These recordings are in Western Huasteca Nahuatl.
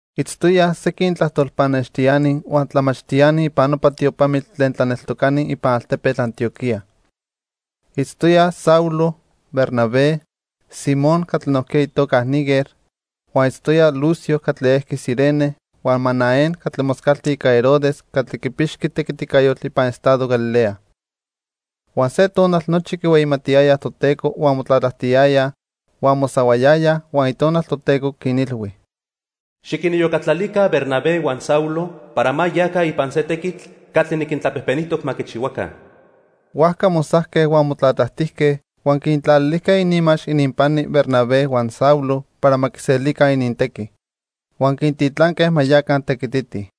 Itztoyaj sequin tlajtol pannextiani huan tlamachtiani ipan nopa tiopamitl tlen tlaneltocani ipan altepetl Antioquía. Itztoyaj Saulo, Bernabé, Simón catli nojquiya itoca Niger huan itztoyaj Lucio catli ejqui Cirene huan Manaén catli moscalti ica Herodes catli quipixqui tequiticayotl ipan estado Galilea. Huan se tonal nochi quihueyimatiyayaj Toteco huan motlatlajtiyayaj, huan mosahuayayaj, huan Itonal Toteco quinilhui: "Xiquiniyocatlalica Bernabé huan Saulo para ma yaca ipan se tequitl catli niquintlapejpenijtoc ma quichihuaca." Huajca mosajque huan motlatlajtijque, huan quintlalilijque ininmax ininpani Bernabé huan Saulo para ma quiselica inintequi. Huan quintitlanque ma yaca tequititij.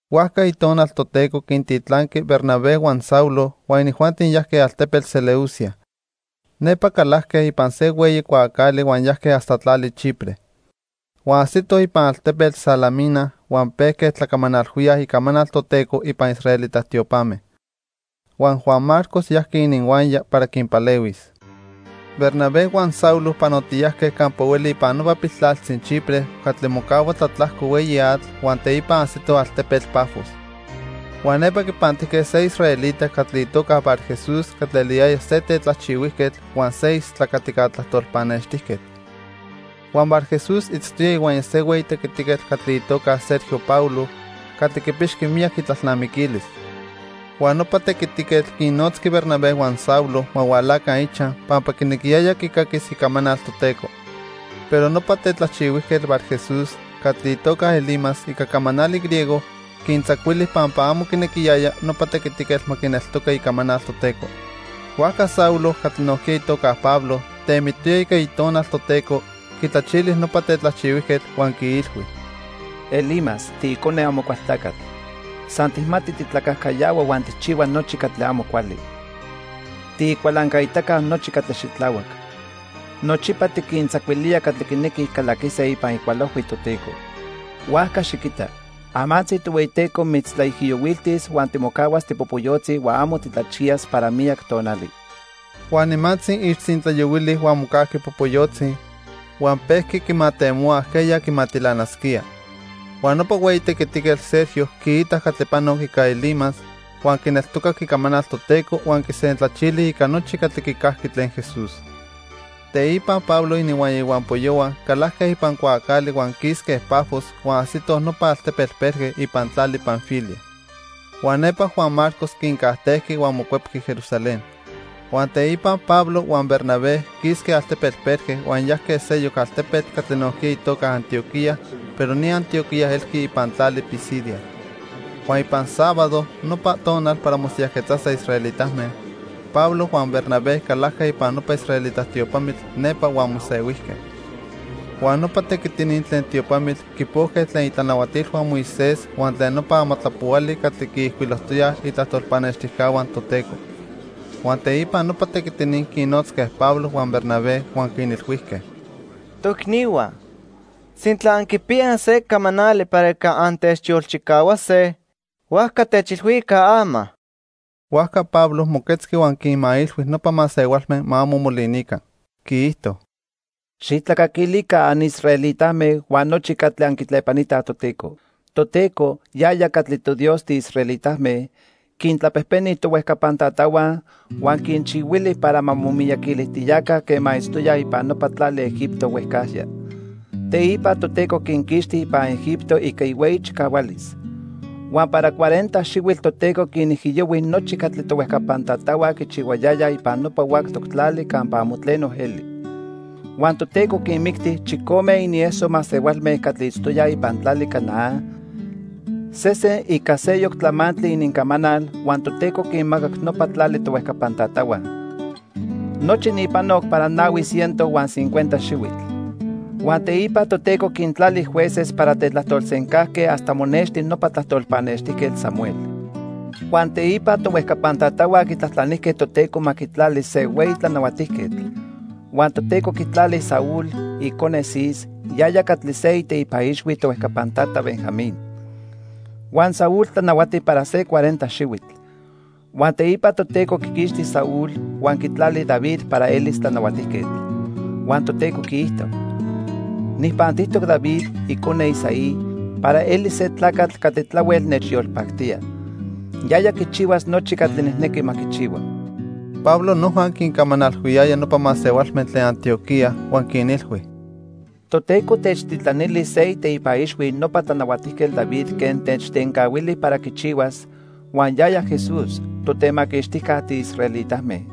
Huajca Itonal Toteco quintitlanqui Bernabé huan Saulo huan inijuanti yajque altepetl Seleucia. Nepa calajque ipan se hueyi cuaacali huan yajque hasta tlali Chipre. Huan ajsitoj ipan altepetl Salamina huan pejque tlacamanalhuíaj icamanal Toteco ipan israelita tiopame. Huan Juan Marcos yajqui ininhuaya para quinpalehuis. Bernabé huan Saulo panotiyajque campa hueli ipan nopa piltlaltzi Chipre catli mocahua tlatlajco hueyi atl huan teipa ajsitoj altepetl Pafos. Huan nepa quipantijque se israelita catli itoca Barjesús catli eliyaya se tetlajchihuijquetl huan se istlacatica tlajtol pannextijquetl. Huan Barjesús itztoya ihuaya se hueyi tequitiquetl catli itoca Sergio Paulo, catli quipixqui miyac itlalnamiquilis. Huan nopa tequitiquetl quinnotzqui Bernabé huan Saulo ma hualaca ichaj pampa quinequiyaya quicaquis icamanal Toteco. Pero nopa tetlajchihuijquetl Barjesús, catli itoca Elimas ica camanali griego, quintzacuili pampa amo quinequiyaya nopa tequitiquetl ma quineltoca icamanal Toteco. Huajca Saulo, catli nojquiya itoca Pablo, temitoya ica Itonal Toteco, quitlachili nopa tetlajchihuijquetl, huan quiilhui: —Elimas, tiicone Amocualtlacatl. San tijmati titlacajcayahua huan tijchihua nochi catli amo cuali. Tiicualancaitaca nochi catli xitlahuac. Nochipa tiquintzacuilía catli quinequij calaquise ipan icualojhui Toteco. Huajca xiquita, amantzi Tohueyiteco mitztlaijiyohuiltis huan timocahuas tipopoyotzi huan amo titlachiyas para miyac tonali. Huan nimantzi ixtzintlayohuili huan mocajqui popoyotzi huan pejqui quimatemohua ajqueya quimatilanasquía. Huan nopa hueyi tequitiquetl Sergio quiitac catli panoc ica Elimas, huan quineltocac icamanal Toteco huan quisentlachili ica nochi catli quicajqui tlen Jesús. Teipa Pablo ininhuaya ihuampoyohua calajque ipan cuaacali huan quisque Pafos huan ajsitoj nopa altepetl Perge ipan tlali Panfilia. Huan nepa Juan Marcos quincajtejqui huan mocuepqui Jerusalén. Huan teipa Pablo huan Bernabé quisque altepetl Perge huan yajque seyoc altepetl catli nojquiya itoca Antioquía pero ni Antioquía elqui ipan tlali Pisidia. Huan ipan sábado, nopa tonal para mosiyajquetzase israelitame, Pablo huan Bernabé calajque ipan nopa israelita tiopamitl nepa huan mosehuijque. Huan nopa tequitini tlen tiopamitl quipojque tlen itlanahuatilhua Moisés huan tlen nopa amatlapohuali catli quiijcuilojtoyaj itlajtol pannextijcahua Toteco. Huan teipa nopa tequitini quinnotzque Pablo huan Bernabé huan quinilhuijque: —Toicnihua, sintla anquipiyaj se camanali para ica antechyolchicahuase, huajca techilhuica ama. Huajca Pablo moquetzqui huan quinmailhui nopa masehualme ma amo molinica. Quiijto: —Xijtlacaquilica anisraelitame huan nochi catli anquitlepanitaj Toteco. Toteco, yaya catli toDios tiisraelitame, quintlapejpeni tohuejcapan tatahua, huan quinchihuili para ma momiyaquilijtiyaca quema itztoyaj ipan nopa tlali Egipto huejcajya. Teipa Toteco quinquixti ipan Egipto ica ihueyi chicahualis. Huan para cuarenta xihuitl Toteco quinijiyohui nochi catli tohuejcapan tatahua quichihuayayaj ipan nopa huactoc tlali campa amo tleno eli. Huan Toteco quinmicti chicome inieso masehualme catli itztoyaj ipan tlali Canaán, sesen ica seyoc tlamantli inincamanal huan Toteco quinmacac nopa tlali tohuejcapan tatahua. Nochi ni panoc para nahui ciento huan cincuenta xihuitl. "Huan teipa Toteco quintlali jueces para tetlajtolsencajque hasta monexti nopa tlajtol pannextijquetl Samuel. Huan teipa tohuejcapan tatahua quitlajtlanijque Toteco ma quitlali se hueyi tlanahuatijquetl. Huan Toteco quitlali Saúl, icone Cis, yaya catli se iteipa ixhui tohuejcapan tata Benjamín. Huan Saúl tlanahuati para se cuarenta xihuitl. Huan teipa Toteco quiquixti Saúl huan quitlali David para elis tlanahuatijquetl. Huan Toteco quiijto: 'Nijpantijtoc David, icone Isaí, para eli se tlacatl catli tlahuel nechyolpactía. Yaya quichihuas nochi catli nijnequi ma quichihua.' " Pablo noja quincamanalhuiyaya nopa masehualme tlen Antioquía huan quinilhui: —Toteco techtitlanili se iteipa ixhui nopa Tlanahuatijquetl David quen techtencahuili para quichihuas, huan yaya Jesús, Totemaquixtijca tiisraelitame.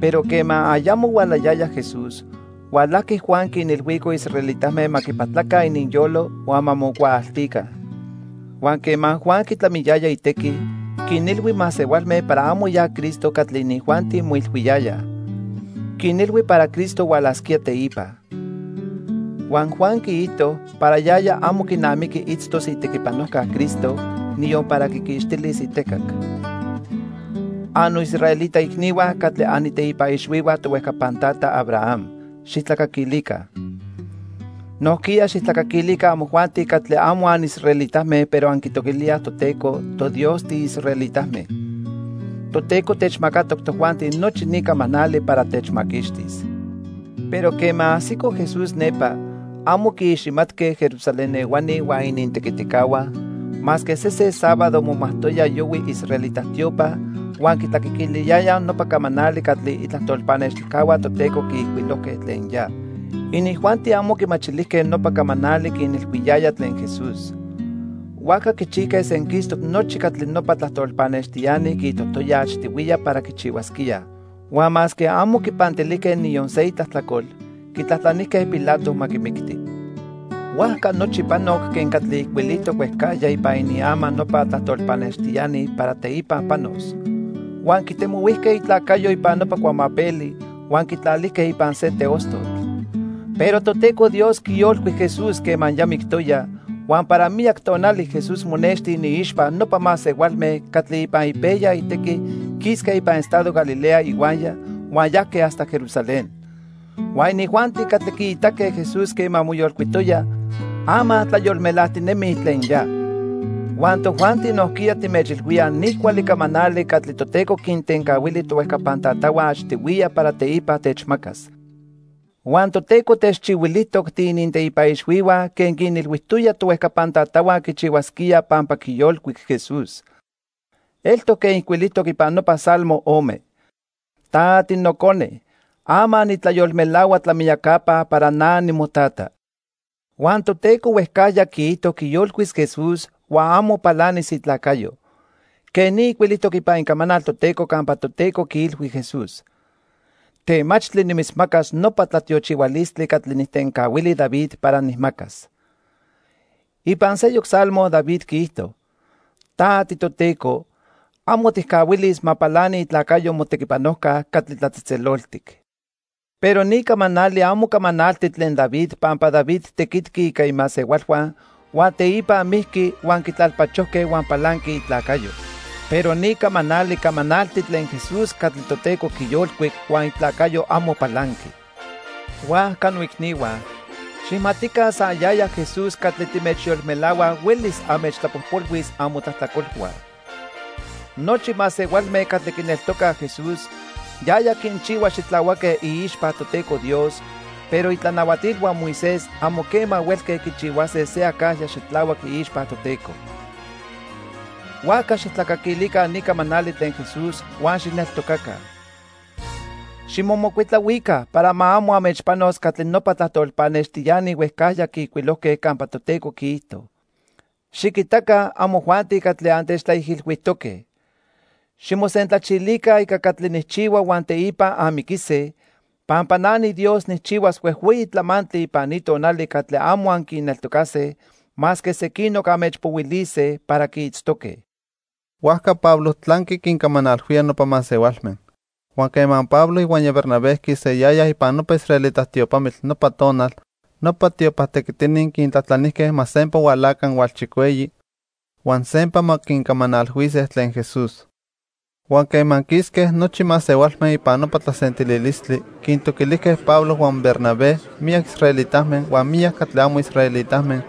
Pero quema ayamo hualayaya Jesús, hualajqui Juan quinilhuico israelitame ma quipatlaca ininyolo huan ma mocuaaltica. Huan quema Juan quitlamiyaya itequi, quinilhui masehualme para amo ya Cristo catli inijuanti moilhuiyayaj. Quinilhui para Cristo hualasquía teipa. Huan Juan quiijto para yaya amo quinamiqui itztos itequipanojca Cristo, niyon para quiquixtilis itecac. "Annoisraelita icnihua catli aniteipa ixhuihua tohuejcapan tata Abraham, xijtlacaquilica. Nojquiya xijtlacaquilica amojuanti catli amo anisraelitame pero anquitoquilíaj Toteco, toDios tiisraelitame. Toteco techmacatoc tojuanti nochi ni camanali para techmaquixtis. Pero quema ajsico Jesús nepa, amo quiiximatque Jerusalén ehuani huan inintequiticahua, masque sesen sábado momajtoyaj yohui israelita tiopa huan quitlacaquilíaj nopa camanali catli itlajtol pannextijcahua Toteco quiijcuilojque tlen ya. Inijuanti amo quimachilijque nopa camanali quinilhuiyaya tlen Jesús. Huajca quichijque senquistoc nochi catli nopa tlajtol pannextiani quiijtojtoyaj achtihuiya para quichihuasquíaj. Huan masque amo quipantilijque niyon se itlajtlacol, quitlajtlanijque Pilato ma quimicti. Huajca nochi panoc quen catli ijcuilijtoc huejcajya ipan iniama nopa tlajtol pannextiani para teipa panos. Huan quitemohuijque itlacayo ipan nopa cuamapeli, huan quitlalijque ipan se teostotl. Pero Toteco Dios quiyolcuic Jesús quema ya mictoya, huan para miyac tonali Jesús monexti iniixpa nopa masehualme catli ipan ipejya itequi quisque ipan estado Galilea ihuaya huan yajque hasta Jerusalén. Huan inijuanti catli quiitaque Jesús quema moyolcuitoya, ama tlayolmelajtinemij tlen ya. "Huan tojuanti nojquiya timechilhuíaj ni cuali camanali catli Toteco quintencahuili tohuejcapan tatahua achtihuiya para teipa techmacas. Huan Toteco techchihuilijtoc tiininteipa ixhuihua quen quinilhuijtoya tohuejcapan tatahua quichihuasquía pampa quiyolcuic Jesús. Eltoc quen ijcuilijtoc ipan nopa Salmo ome: 'Ta tiNocone. Ama nitlayolmelahua tlamiyacapa para na nimoTata.' Huan Toteco huejcajya quiijto quiyolcuis Jesús huan amo palanis itlacayo. Quej ni ijcuilijtoc ipan Icamanal Toteco campa Toteco quiilhui Jesús: 'Temachtli nimitzmacas nopa tlatiochihualistli catli nijtencahuili David para nijmacas.' Ipan seyoc Salmo David quiijto: 'Ta tiToteco, amo tijcahuilis ma palani itlacayo Motequipanojca Catli Tlatzejtzeloltic.' "Pero ni camanali amo camanalti tlen David pampa David tequitqui ica imasehualhua huan teipa mijqui huan quitlalpachojque huan palanqui itlacayo. Pero ni camanali camanalti tlen Jesús catli Toteco quiyolcuic huan itlacayo amo palanqui. Huajca noicnihua, xijmatica san yaya Jesús catli timechyolmelahuaj huelis anmechtlapojpolhuis amotlajtlacolhua. Nochi masehualme catli quineltocaj Jesús, yaya quinchihua xitlahuaque iixpa Toteco Dios, pero itlanahuatilhua Moisés amo quema huelque quichihuase se acajya xitlahuac iixpa Toteco. Huajca xijtlacaquilica ni camanali tlen Jesús huan xijneltocaca. Ximomocuitlahuica para amo ma anmechpanos catli nopa tlajtol pannextiani huejcajya quiijcuilojque campa Toteco quiijto: 'Xiquitaca, amojuanti catli antechtlaijilhuijtoque. Ximosentlachilica ica catli nijchihua huan teipa anmiquise, Pampa na niDios nijchihuas huejhueyi tlamantli ipan ni tonali catli amo anquineltocase masque sequinoc anmechpohuilise para quiitztoque.' " Huajca Pablo tlanqui quincamanalhuía nopa masehualme. Huan quema Pablo ihuaya Bernabé quisayayaj ipan nopa israelita tiopamitl nopa tonal, nopa tiopa tequitini quintlajtlanijque ma sempa hualaca hualchicueyi, huan sempa ma quincamanalhuise tlen Jesús. Huan quema quisque nochi masehualme ipan nopa tlasentililistli, quintoquilijque Pablo huan Bernabé miyac israelitame huan miyac catli amo israelitame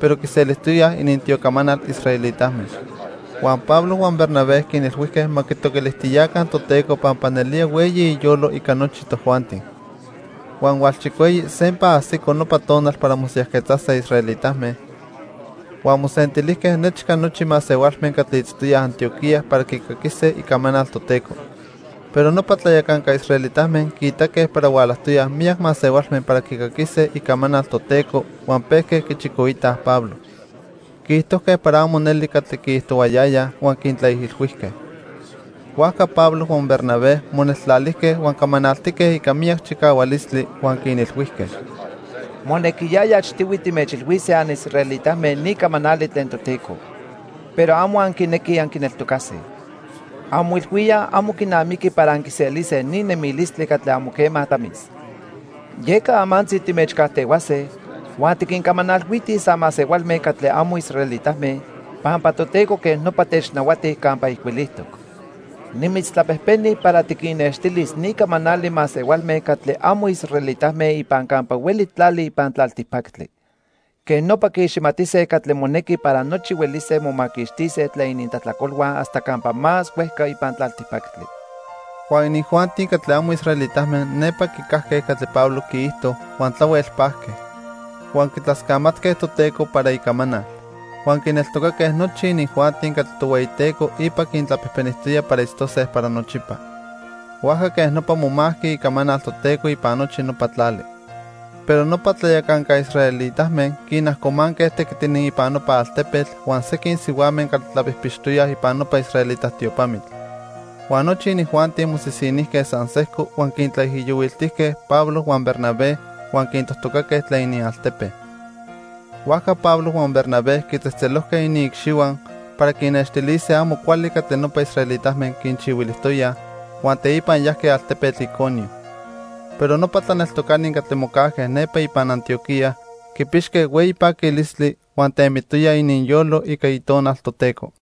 pero quiselijtoyaj inintiocamanal israelitame. Huan Pablo huan Bernabé quinilhuijque ma quitoquilijtiyaca Toteco pampa nelía hueyi iyolo ica nochi tojuanti. Huan hualchicueyi sempa ajsico nopa tonal para mosiyajquetzase israelitame, huan mosentilijque nechca nochi masehualme catli itztoyaj Antioquía para quicaquise icamanal Toteco. Pero nopa tlayacanca israelitame quiitaque para hualajtoyaj miyac masehualme para quicaquise icamanal Toteco huan pejque quichicoitaj Pablo. Quiijtojque para amo neli catli quiijtohuayayaj huan quintlaijilhuijque. Huajca Pablo huan Bernabé moneltlalijque huan camanaltique ica miyac chicahualistli huan quinilhuijque: —Monequiyaya achtihui timechilhuise anisraelitame ni camanali tlen Toteco. Pero amo anquinequij anquineltocase. Anmoilhuíaj amo quinamiqui para anquiselise ni nemilistli catli amo quema tlamis. Yeca amantzi timechcajtehuase huan tiquincamanalhuitij san masehualme catli amo israelitame, pampa Toteco quej nopa technahuati campa ijcuilijtoc: 'Nimitztlapejpeni para tiquinnextilis ni camanali masehualme catli amo israelitame ipan campa hueli tlali ipan tlaltipactli. Quej nopa quiiximatise catli monequi para nochi huelise momaquixtise tlen inintlajtlacolhua hasta campa más huejca ipan tlaltipactli.' Huan inijuanti catli amo israelitame nepa quicajque catli Pablo quiijto, huan tlahuel pajque. Huan quitlascamatque Toteco para icamanal. Huan quineltocaque nochi inijuanti catli Tohueyiteco ipa quintlapejpenijtoya para itztose para nochipa. Huajca quej nopa momajqui icamanal Toteco ipan nochi nopa tlali. Pero nopa tlayacanca israelitame quinajcomanque tequitini ipan nopa altepetl huan sequin sihuame catli tlapijpixtoyaj ipan nopa israelita tiopamitl. Huan nochi inijuanti mosisinijque san sejco huan quintlaijiyohuiltijque Pablo huan Bernabé huan quintojtocaque tlen inialtepe. Huajca Pablo huan Bernabé quitzejtzelojque iniicxihua para quinnextilise amo cuali catli nopa israelitame quinchihuilijtoyaj, huan teipa yajque altepetl Iconio. Pero nopa tlaneltocani catli mocajque nepa ipan Antioquía quipixque hueyi paquilistli huan temitoyaj ininyolo ica Itonal Toteco.